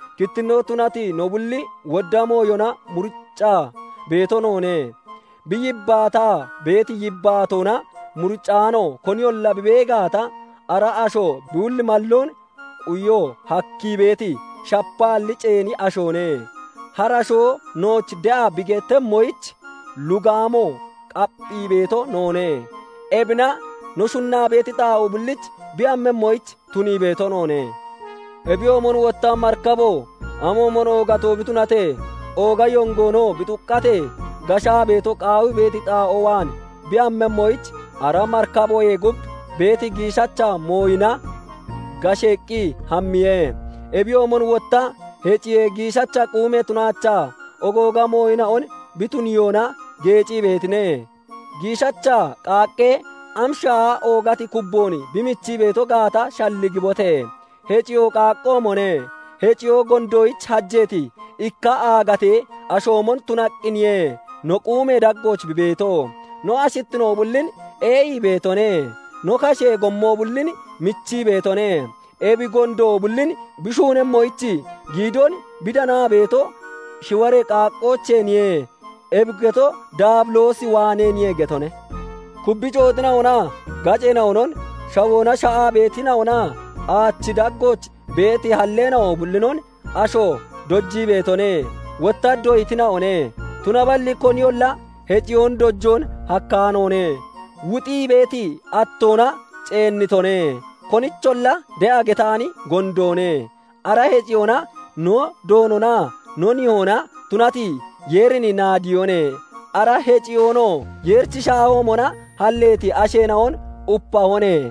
Kittinnoo tunati no bulli wodda mooyona muriccaa beeto noone; bi yibbaataa beeti yibbaatoona muricaano koniyolla bi bee gaata, ara asho bi hulli malloon quyo hakkii beeti, shapaalli ceeni ashoone. Harashoo nooch de'a bi gettemmoyich lugaamoo qapphii beeto noone; ebina no shunnaa beeti xaa'oo bulliich bi hammemmoyich tunii beeto noone. Ebiyoomon wotta, marikabo amoomon oogato bi tunatee, ooga yongoonoo bi xuqqatee, gashaa beeto qaawii beeti xaa'oo waan bi hammemmoyich, ara marikaboyee gub beeti giishacha mooyina gasheeqqi hammiye. Ebiyoomon wotta heciye giishacha quume tunaachaa ogooga mooyina'on bi tuniyoona geecii beetine. Giishacha qaaqqee am shaaha oogati kubboon bi michii beeto gaata shalligibote! Heciyoo qaaqqoomone; heciyoo gondoyich hajeeti ikka aagatee ashoomon tunaqqiniye no quumee daggooch bi beeto; no ashittino bullin ee'ii beetone; no kashee gommo bullin michii beetone; ebi gondo bullin bi shuunemmoyich giidoon bi danaa beeto shiwaree qaaqqoocheeniye; ebi getoo Daabiloos waaneeniye getone. Kubbi cooxina'onaa gaceena'onon, shawoona sha'aa beetina'onaa aachi daggooch beeti halleena'o bullinon asho dojii beetone; wotta doyitina'one; tunaballi koniyolla heciyoon dojoon hakkaanoone; wuxii beeti attoona ceennitone; konicholla de'a getaani gondoone. Ara heciyoona no Doononaa no Nihoona tunati Yeerin naadiyone; ara heciyoonoo Yeerichi shaahoomona halleeti asheena'on upahone;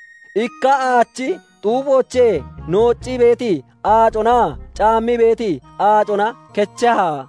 Ikka aachi xuuphoochee nooccii beeti aaconaa caammii beeti aacona kecheha?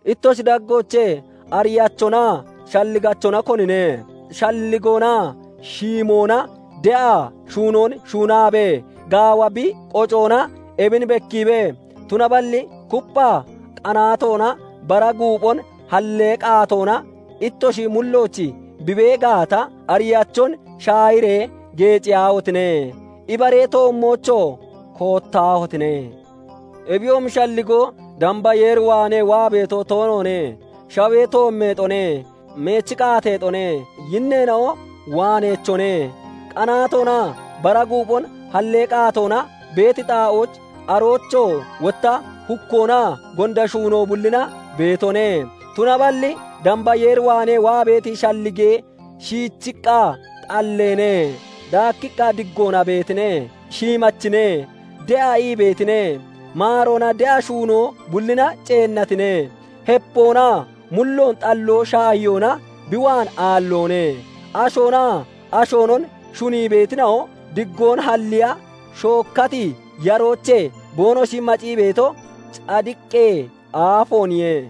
Ittoshi daggoochee ariyachonaa shalligachona konine? Shalligoonaa shiimoona de'a shuunoon shuunabee gaawa bi qocoona ebin bekkiibe. Tunaballi kuppha qanaatoonaa bara guuphon hallee qaatoona ittoshi mullooch bi bee gaata, ariyachon shaahiree geeciyaahotine! Ibaree toommoochoo koottaahotine! Ebiyoomi shalligoo damba Yeer waanee waa beeto toonoone; shawee toommeexone; meechi qaateexone; yinneena'o waaneechone; qanaatoonaa bara guuphon hallee qaatoona beeti xaa'ooch, aroochoo wotta hukkoonaa gonda shuunoo bullina beetone; tunaballi damba Yeer waanee waa beeti shallige shiichiqqa xalleene; daakkiqqa diggoona beetine; shiimachine; de'a ii beetine; maaroonaa de'a shuunoo bullina ceennatine; hepoonaa mulloon xalloo shaahiyoona bi waan aalloone. Ashoonaa ashoonon shunii beetina'o diggoon halliya shookkati yaroochee boonoshi macii beeto cadiqee aafooniye.